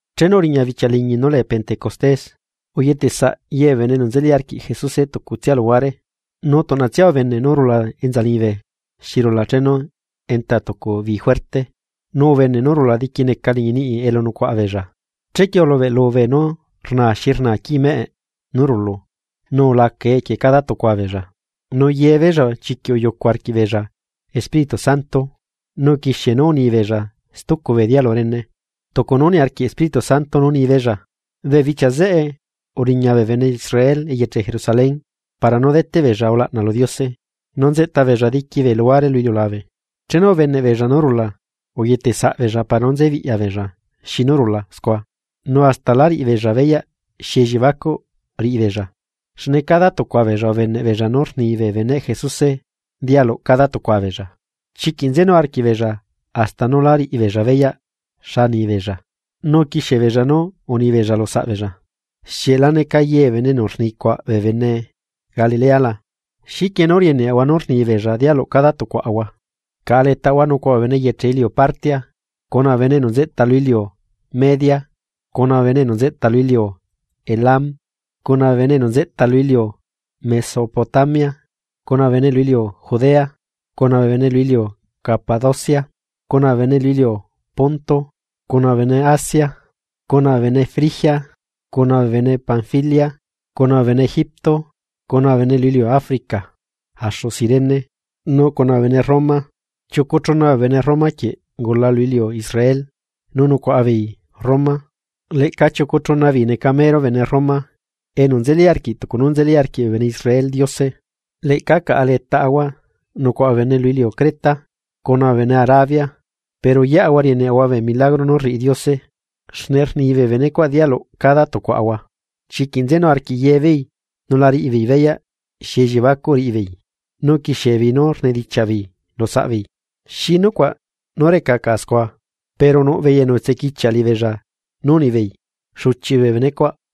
Chenu uriña bichia liñi nú lee Pentecostés, uyetesaꞌ ye bee bene enu nzeli arquiꞌ Jesuse tucutsia luhuare. Nu tuꞌnatsia ubene nú rula enza liñibe xi rula chenu enta tucu bi juerte, nu ubene nú rula diquineca liñi niꞌi elu nucuaꞌa beella. Chequie ulubeꞌlu beenú rnaa xi rnaa quii meꞌe nú rulu, nu ulacae equie cada tucua beella. Nu yebeella chiquiꞌ uyucu arquiꞌbeella Espíritu Santo, nu uquixie nú unibeella stucu bee dialu rene, tucu nú niarquiꞌ Espíritu Santo nú ni beella. Bee bichia zeꞌe uriña bee bene Israel eyeche Jerusalén para nú deteꞌ beella ulaꞌna lu Diose, nu nzeꞌta beella diqui bee luhuare lu iliulabe. Chenu ubeneꞌbeella nú rula, uyetesaꞌbeella para nú nze biꞌya beella xi nú rula scua, nu hasta la riꞌibeella beyaꞌ xi elliebacuꞌ riꞌibeella, xne cada tucua beella ubeneꞌ beella nú rni bee beneꞌ Jesuse dialuꞌ cada tucua beella. Chiquiꞌ nzenu arquiꞌbeella hasta nú lá riꞌibeella beyaꞌ xa ni beella, nu uquixie beella nú unibeella lusaꞌbeella: ―¿Xieꞌ la neca ye bee bene enu rni cuaꞌ bee bene Galilea la? ¿Xiquie nú rieneꞌahua nú rnibeella dialuꞌ cada tucuaꞌahua? Caꞌa letaꞌahua nucuaꞌa bee bene eyeche iliu Partia, cuna bee bene enu nzeꞌta lu iliu Media, cuna bee bene enu nzeꞌta lu iliu Elam, cuna bee bene enu nzeꞌta lu iliu Mesopotamia, cuna bee bene lu iliu Judea, cuna bee bene lu iliu Capadocia, cuna bee bene lu iliu Ponto, cuna bee bene Asia, cuna bee bene Frigia, cuna bee bene Panfilia, cuna bee bene Egipto, cuna bee bene lu iliu Africa, axu Cirene. Nu cuna bee bene Roma, chiucu chuna bee bene Roma quieꞌ ungula lu iliu Israel nu nucuaꞌa beei Roma. Leꞌca chiucu chuna beei neca mero bene Roma enu nzeli arquiꞌ tucu nú nzeli arquiꞌ bee bene Israel Diose. Leꞌca caꞌa letaꞌahua nucuaꞌa bee bene lu iliu Creta cuna bee bene Arabia, pero yeꞌahua rieneꞌahua bee milagro nú rriꞌi Diose xne rni bee bene cuaꞌ dialuꞌ cada tucuaꞌahua. Chiquiꞌ nzenu arquiꞌ ye beei nu la riꞌibeei beyaꞌ xi elliebacuꞌ riꞌibeei, nu uquixiebeei nú rnidichiaꞌ beei lu saꞌbeei: ―¿Xi nucuaꞌ nú reca caꞌa scua? Pero nuꞌ beei enu utsequichiaꞌ liꞌibeella nú unibeei: ―¡Xuchiꞌ bee bene cuaꞌ!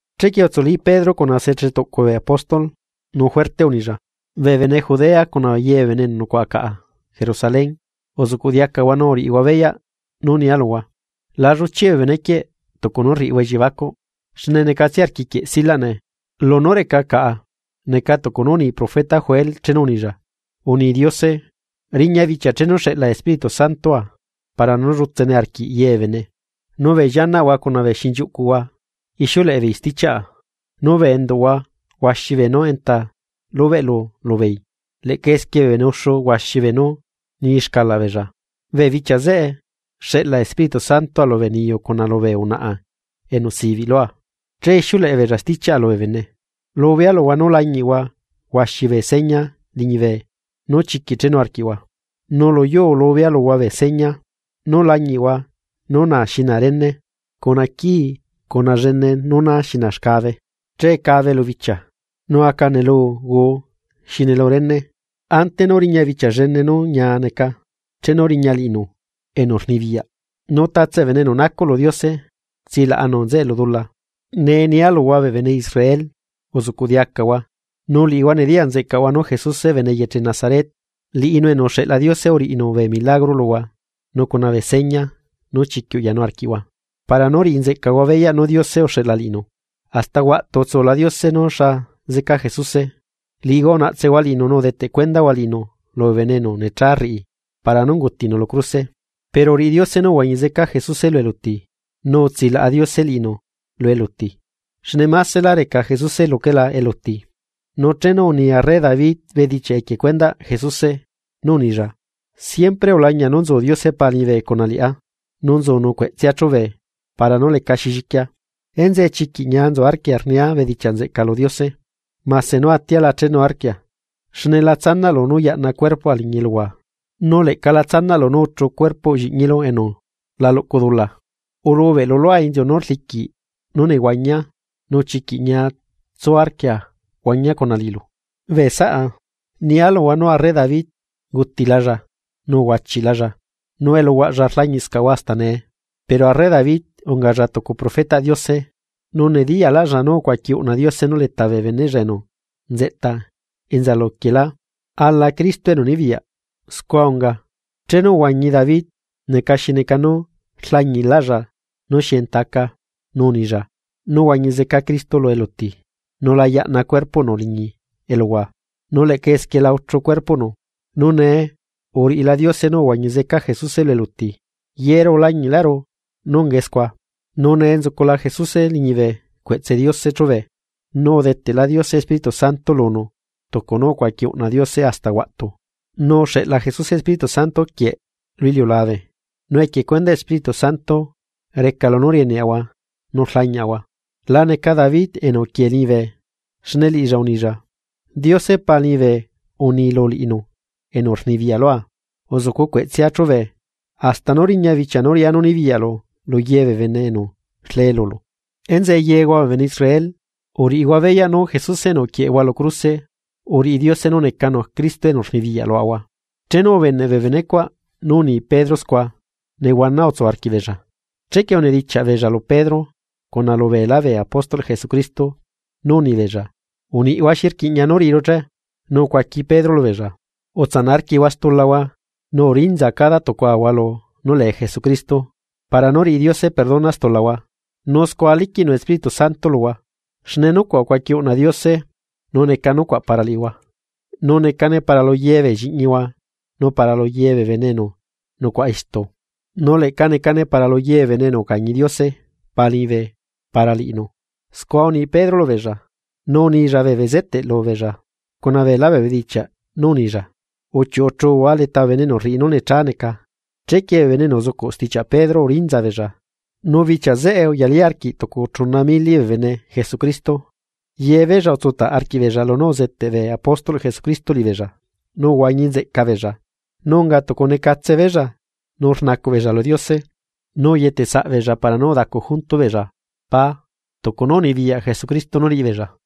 Chequie utsuli Pedro cuna se chetuꞌcu bee apóstol nu juerte unilla: ―Bee bene Judea cuna ye bee bene enu nucuaꞌa caꞌa Jerusalén, uzuꞌcuꞌ diacahua nu uriꞌihua beyaꞌ nú nia luhua. La lluchiꞌ bee bene quieꞌ tucu nú rriꞌihua elliebacuꞌ, xne apena neca rquiquieꞌ silaꞌ nee. Lunú reca caꞌa, neca tucu nú uni profeta Joel chenu unilla: Uni Diose, riña bichia chenu xeꞌla Espíritu Santoa para nú llutsene arquiꞌ ye bee bene; Nu bee llianaꞌhua cuna bee xinchiuꞌcuhua ixiuleꞌe beei stichiaꞌa, nu bee enduꞌhua huaxi beenú enta lubeꞌlu lubeei, leꞌca esquie bee bene uxu huaxi beenú ni xcalaꞌ beella. Bee bichia zeꞌe xeꞌla Espíritu Santoa lubee niyu cuna lubee unaꞌa enu sibiꞌ lua, che ixiuleꞌe beella stichiaꞌa lubee bene. Lubea luhua nú lañiꞌhua huaxi bee seña liñibe nu chiquiꞌ chenu arquiꞌhua, nu lu yuu lubea luhua bee seña: Nu lañiꞌhua nú na xi na rene, cuna quii cuna llene nu na xi na xcabe. Che cabe lu bichia, nu aca nelu guu xi nelu rene, ante nú riña bichia llene nú ñia neca, chenu riña liꞌinu, enu rnibiyaꞌ. Nu tatse bee bene enu nacuꞌ lu Diose, tsilaꞌanu nzeꞌe lu dula. ’Nee nia luhua bee bene Israel, uzuꞌcuꞌ diacahua, nú liꞌihua nediyaꞌ nzeꞌcaꞌhua nú Jesuse bene eyeche Nazaret, liꞌinu enu uxeꞌla Diose uriꞌinu bee milagro luhua nu cuna bee seña nú chiquiꞌ uyanu arquiꞌhua para nú riꞌi nzeꞌcahua beyaꞌ nú Diose uxeꞌla liꞌinu. Hasta huaꞌtu utsula Diose nú xa zeca Jesuse, liꞌihua unaꞌtsehua liꞌinu nu udeteꞌ cuendahua liꞌinu lubee bene enu necha rriꞌi para nú ungutinu lu cruse. Pero uriꞌi Diose nú uhuañi zeca Jesuse lu eluti, nu utsilaꞌa Diose liꞌinu lu eluti, xne másela reca Jesuse luquela eluti. Nu chenu uni arre David bedichiaꞌ equie cuendaꞌ Jesuse, unilla: Siempre ulañia nú nzu Diose Pa liñibe cuna liꞌá. Nu nzunu cueꞌtsea chubee para nú lecaxi lliquia. Enzeꞌe chiquiꞌ ñia nzu arquia rnia bedichiaꞌ nzeꞌca lu Diose. Mase nú atia la chenuarquia, xne la tsanaꞌlu nú yaꞌna cuerpoa liñi eluhua, nu leꞌca la tsanaꞌlu nú uchu cuerpoꞌ Lliꞌñilu enu la luꞌcu dula. Ulubeꞌlu lua inziu nú rliquiꞌ nú nehuañia nu chiquiꞌ ñia tsu arquia huañia cuna liꞌilu. ’Bee saꞌa, nia luhua nú arre David ungutilalla nu uhuachiꞌlalla, nu eluhuaꞌlla rlañiꞌscahua hasta nee. Pero arre David ungalla tucu profetaꞌ Diose, nu nediyaꞌlaꞌlla nú ucuaqui uꞌna Diose nú leta bee beneꞌlla enu nzeꞌta enza luquiela ala Cristo enu nibiyaꞌ. Scua unga, chenu uhuañi David neca xi neca nú rlañiꞌláꞌlla nú xi enta aca, nu unilla nú huañi zeca Cristo lu eluti nu la yaꞌna cuerpoꞌnu liñi eluhua, nu leꞌca esquie la uchu cuerpoꞌnu. Nu nee uriꞌila Diose nú uhuañi zeca Jesuse lu eluti, yeru ulañiꞌlaꞌru nú ungae scua. Nu nee nzucula Jesuse liñibe cueꞌtse Diose chúbe, nu udeteꞌla Diose Espíritu Santo lunu tucu nú ucuaqui uꞌna Diose hasta huaꞌtu, nu uxeꞌla Jesuse Espíritu Santo quieꞌ lu iliulabe nu equie cuendaꞌ Espíritu Santo reca lunú rieneꞌahua nu rlañiꞌahua. La neca David enu uquie liñibe, xne liꞌilla unilla: Diose Pa liñibe uni lu liꞌinu enu rnibiyaꞌ lua: “Uzucu cueꞌtsea chube, hasta nú riña bichia nú riꞌá nú nibiyaꞌlu lu ye bee bene enu rle lulu.” ’Enzeꞌe yehua bee bene Israel, uriꞌihua beyaꞌ nú Jesuse enu uquieꞌehua lu cruse, uriꞌi Diose nú necanu Cristo enu rnibiyaꞌ luaꞌahua. Chenu ubeneꞌ bee bene cuaꞌ nú uni Pedro scua, nehuana utsu arquiꞌbeella, chequie unidichiaꞌ beella lu Pedro cuna lubeelá bee apóstolꞌ Jesucristo nú unibeella: ―Uniꞌhua, ¿xi rquiꞌña nú riꞌiru che? Nu ucuaqui Pedro lubeella: ―Utsanaꞌ arquiꞌhua stulahua, nu urinza cada tucuahua lu nú lee Jesucristo para nú riꞌi Diose perdona stulahua, nu scua liquiꞌnu Espíritu Santo luhua. Xne nucuaꞌ ucuaqui uꞌna Diose, nu neca nucuaꞌ para liꞌihua, nu necane para lu ye bee lliꞌñihua nu para lu ye bee bene enu nucuaꞌa istu, nu leꞌca necane para lu ye bee bene enu ucañi Diose Pa liñibe para liꞌinu. Scua uni Pedro lubeella, nu unilla bee bezeteꞌ lubeella cuna beelá bee bedichiaꞌ nú unilla: ―¡Uchiuꞌuchuhua leta bee bene enu rriꞌi nú necha neca! Chequie bee bene enu uzucuꞌ stichiaꞌ Pedro urinza beella, nu bichia zeꞌe uyalí arquiꞌ tucu chuna mili bee bene Jesucristo. Yebeella utsutaꞌ arquiꞌbeella lunú uzeteꞌ bee apóstolꞌ Jesucristo liꞌibeella, nu uhuañinzeꞌca beella, nu unga tucu necatse beella nu rnacuꞌ beella lu Diose, nu uyetesaꞌbeella para nú udacu junto beella pá tucu nú unibiyaꞌ Jesucristo nú riꞌi beella.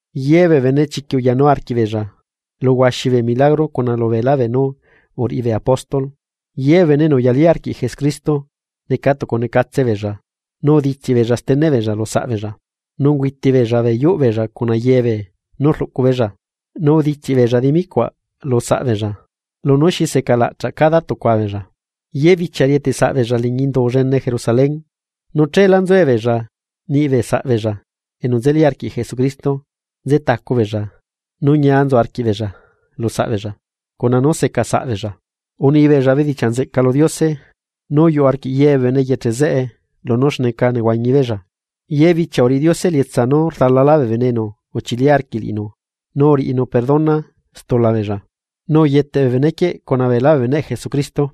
Ye bee bene chiquiꞌ uyanu arquiꞌbeella, lu huaxi bee milagro cuna lubeela beenú uriꞌi bee apóstol. Ye bee bene enu uyalí arquiꞌ Jesucristo neca tucu necatse beella nu uditsiꞌ beella steneꞌ beella lu saꞌbeella, nu ungüiti beella bee yuꞌ beella cuna ye beenú rluꞌcu beella, nu uditsiꞌ beella dimi cuaꞌ lu saꞌbeella lunú xi seca laꞌchaꞌ cada tucua beella. Ye bichia rieteꞌ saꞌbeella liñi Indu llene Jerusalén, nu cheelá nzuebeella niꞌbee saꞌbeella enu nzeli arquiꞌ Jesucristo nze tacu beella eta nu ñia nzu arquiꞌbeella lu saꞌ beella cuna nú seca saꞌbeella. Unibeella bedichiaꞌ nzeꞌca lu Diose, nu uyuꞌ arquiꞌ ye bee bene eyeche zeꞌe lunú xneca nehuañi beella, ye bichia uriꞌi Diose elietsa nú rdalalá bee bene enu uchili arquiꞌ liꞌinu nu uriꞌinu perdona stula beella, nu uyeteꞌ bee bene quieꞌ cuna beelá beneꞌ Jesucristo.